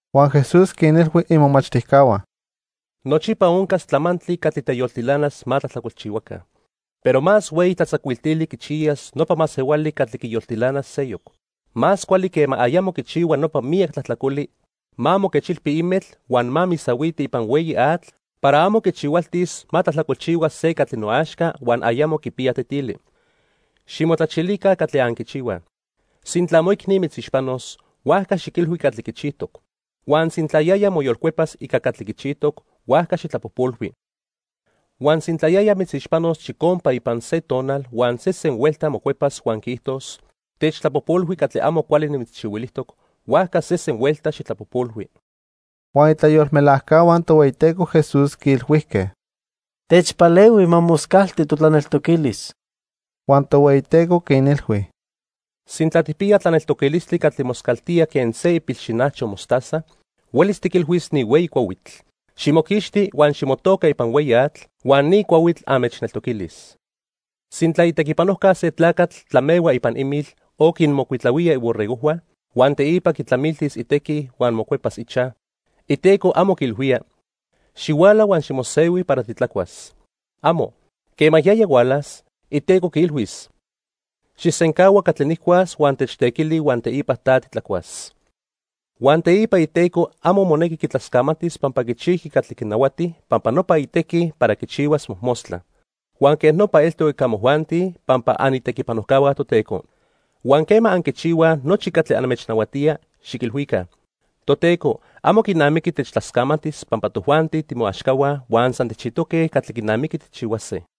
Huan Jesús quinilhui imomachtijcahua: "Nochipa oncas tlamantli catli teyoltilanas ma tlajtlacolchihuaca. Pero más hueyi tlatzacuiltili quichiyas nopa masehuali catli quiyoltilanas seyoc. Más cuali quema ayamo quichihua nopa miyac tlajtlacoli, ma moquechilpi imetl huan ma misahuiti ipan hueyi atl para amo quichihualtis ma tlajtlacolchihua se catli noaxca huan ayamo quipiya tetili. Ximotlachilica catli anquichihuaj. "Sintla moicni mitzixpanos, huajca xiquilhui catli quichijtoc. Huan sintla yaya moyolcuepas ica catli quichijtoc, huajca xijtlapojpolhui. Huan sintla yaya mitzixpanos chicompa ipan se tonal huan sesen huelta mocuepas huan quiijtos: 'Techtlapojpolhui catli amo cuali nimitzchihuilijtoc', huajca sesen huelta xijtlapojpolhui." Huan itlayolmelajcahua Tohueyiteco Jesús quiilhuijque: —Techpalehui ma moscalti totlaneltoquilis. Huan Tohueyiteco quinilhui: —Sintla tijpiya tlaneltoquilistli catli moscaltía quen se ipilxinajcho mostaza, huelis tiquilhuis ni hueyi cuahuitl: 'Ximoquixti huan ximotoca ipan hueyi atl', huan ni cuahuitl anmechneltoquilis. "Sintla itequipanojca se tlacatl tlamehua ipan imil o quinmocuitlahuía iborregojhua, huan teipa quitlamiltis itequi huan mocuepas ichaj, iteco amo quiilhuía: 'Xihuala huan ximosehui para titlacuas.' ¡Amo! Quema yaya hualas, iteco quiilhuis: 'Xijsencahua catli nijcuas huan techtequili huan teipa ta titlacuas.' Huan teipa iteco amo monequi quitlascamatis pampa quichijqui catli quinahuati, pampa nopa itequi para quichihuas mojmostla. Huan quej nopa eltoc ica amojuanti, pampa anitequipanojcahua Toteco. Huan quema anquichihuaj nochi catli anmechnahuatía, xiquilhuica: 'Toteco, amo quinamiqui techtlascamatis pampa tojuanti timoaxcahua huan san tijchijtoque catli quinamiqui tijchihuase.' "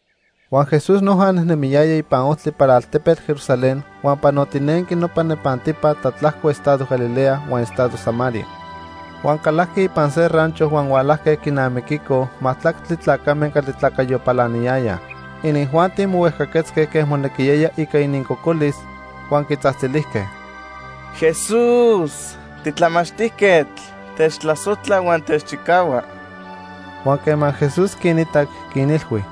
Huan Jesús noja nejnemiyaya ipan ojtli para altepetl Jerusalén huan panotinenqui nopa nepantipa tlatlajco estado Galilea huan estado Samaria. Huan calajqui ipan se rancho huan hualajque quinamiquicoj majtlactli tlacame catli tlacayo palaniyayaj. Inijuanti mohuejcaquetzque quen monequiyaya ica inincocolis, huan quitzajtzilijque: —Jesús, titlamachtijquetl, techtlasojtla huan techchicahua. Huan quema Jesús quinitac, quinilhui: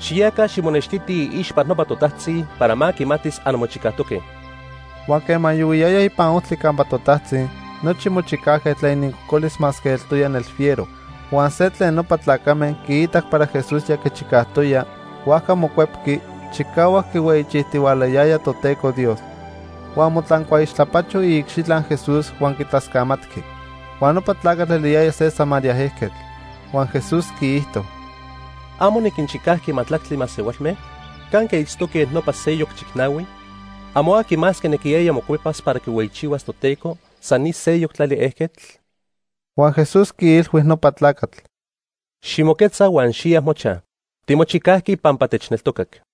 —Xiyaca ximonextitij iixpa nopa totajtzi para ma quimatis anmochicajtoque. Huan quema yohuiyayaj ipan ojtli campa totajtzi, nochi mochicajque tlen inincocolis masque eltoya nelfiero. Huan se tlen nopa tlacame quiitac para Jesús ya quichicajtoya, huajca mocuepqui, chicahuac quihueyichijtihualayaya Toteco Dios. Huan motlancuaixtlapacho iicxitla Jesús huan quitlascamatqui. Huan nopa tlacatl eliyaya se Samaria ejquetl. Huan Jesús quiijto: —¿Amo niquinchicajqui majtlactli masehualme? ¿Canque itztoque nopa seyoc chicnahui? ¿Amo aqui más quinequiyaya mocuepas para quihueyichihuas Toteco, san ni seyoc tlali ejquetl? Huan Jesús quiilhui nopa tlacatl: —Ximoquetza huan xiya mochaj. Timochicajqui pampa techneltocac.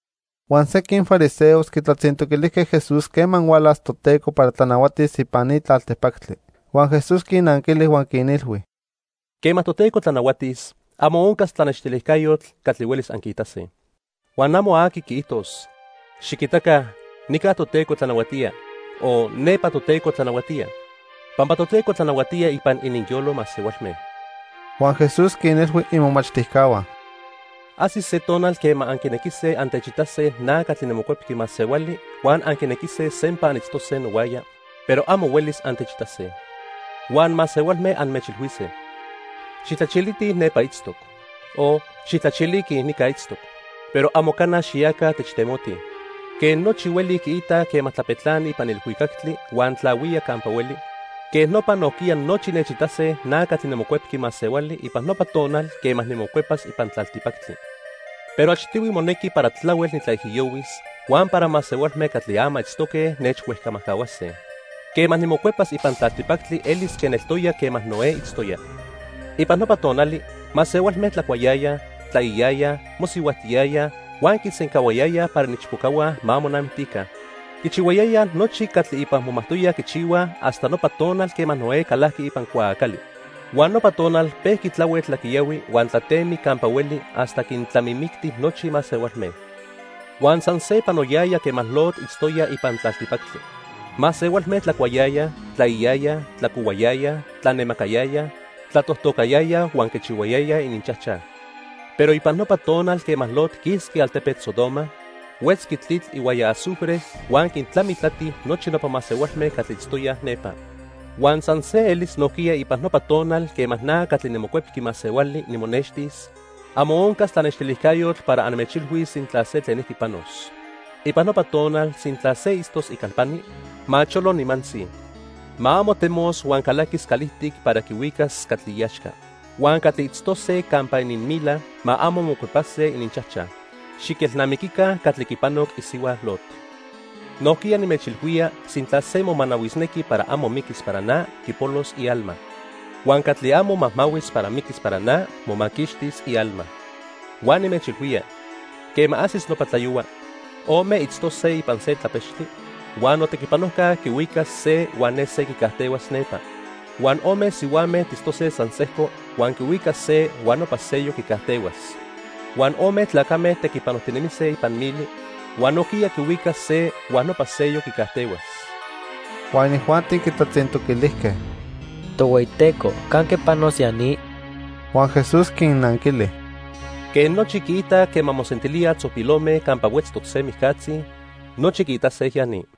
Huan sequin fariseos quitlatzintoquilijque Jesús quema hualas Toteco para tlanahuatis ipan ni tlaltipactli. Huan Jesús quinnanquili huan quinilhui: —Quema Toteco tlanahuatis, amo oncas tlanextilijcayotl catli huelis anquiitase. Huan amo aqui quiijtos: 'Xiquitaca, nica Toteco tlanahuatía' o 'Nepa Toteco tlanahuatía', pampa Toteco tlanahuatía ipan ininyolo masehualme. Huan Jesús quinilhui imomachtijcahua: —Ajsis se tonal quema anquinequise antechitase na catli niMocuepqui Masehuali huan anquinequise sempa anitztose nohuaya, pero amo huelis antechitase. Huan masehualme anmechilhuise: 'Xijtlachilitij nepa itztoc', o 'xijtlachiliquij nica itztoc' pero amo cana xiyaca techtemotij. Quen nochi hueli quiitaj quema tlapetlani ipan ilhuicactli huan tlahuía campa hueli, quej nopa nojquiya nochi nechitase na catli niMocuepqui Masehuali ipan nopa tonal quema nimocuepas ipan tlaltipactli. Pero achtihui monequi para tlahuel nitlaijiyohuis, huan para masehualme catli ama itztoque nechhuejcamajcahuase. "Quema nimocuepas ipan tlaltipactli elis quen eltoya quema Noé itztoya. Ipan nopa tonali, masehualme tlacuayayaj, tlaiyayaj, mosihuajtiyayaj huan quisencahuayayaj para iniichpocahua ma monamictica. Quichihuayayaj nochi catli ipa momajtoyaj quichihuaj hasta nopa tonal quema Noé calajqui ipan cuaacali. Huan nopa tonal pejqui tlahuel tlaquiyahui huan tlatemic campa hueli hasta quintlamimicti nochi masehualme. "Huan san se panoyaya quema Lot itztoya ipan tlaltipactli. Masehualme tlacuayayaj, tlaiyayaj, tlacohuayayaj, tlanemacayayaj, tlatojtocayayaj huan quichihuayayaj ininchajchaj. Pero ipan nopa tonal quema Lot quisqui altepetl Sodoma, huetzqui tlitl ihuaya azufre huan quintlamitlati nochi nopa masehualme catli itztoyaj nepa. Huan san se elis nojquiya ipan nopa tonal quema na catli niMocuepqui Masehuali nimonextis, amo oncas tlanextilijcayotl para anmechilhuis sintla se tlenijqui panos. "Ipan nopa tonal sintla se itztos icalpani, ma cholo nimantzi. Ma amo temos huan calaquis calijtic para quihuicas catli iaxca. Huan catli itztose campa ininmila ma amo mocuepase ininchajchaj. Xiquelnamiquica catli quipanoc isihua Lot. Nojquiya nimechilhuía sintla se momanahuisnequi para amo miquis para na, quipolos ialma. Huan catli amo majmahuis para miquis para na, quimaquixtis ialma. "Huan nimechilhuía, quema ajsis nopa tlayohua, ome itztose ipan se tlapechtli, huan notequipanojca quihuicas se huan ne se quicajtehuas nepa. Huan ome sihuame tistose san sejco, huan quihuicas se huan nopa seyoc quicajtehuas. Huan ome tlacame tequipanojtinemise ipan mili, huan nojquiya quihuicas se huan nopa seyoc quicajtehuas." Huan inijuanti quitlatzintoquilijque: —Tohueyiteco, ¿canque panos ya ni? Huan Jesús quinnanquili: —Quen nochi quiitaj quema mosentilíaj tzopilome campa huetztoc se mijcatzi, nochi quiitase ya ni.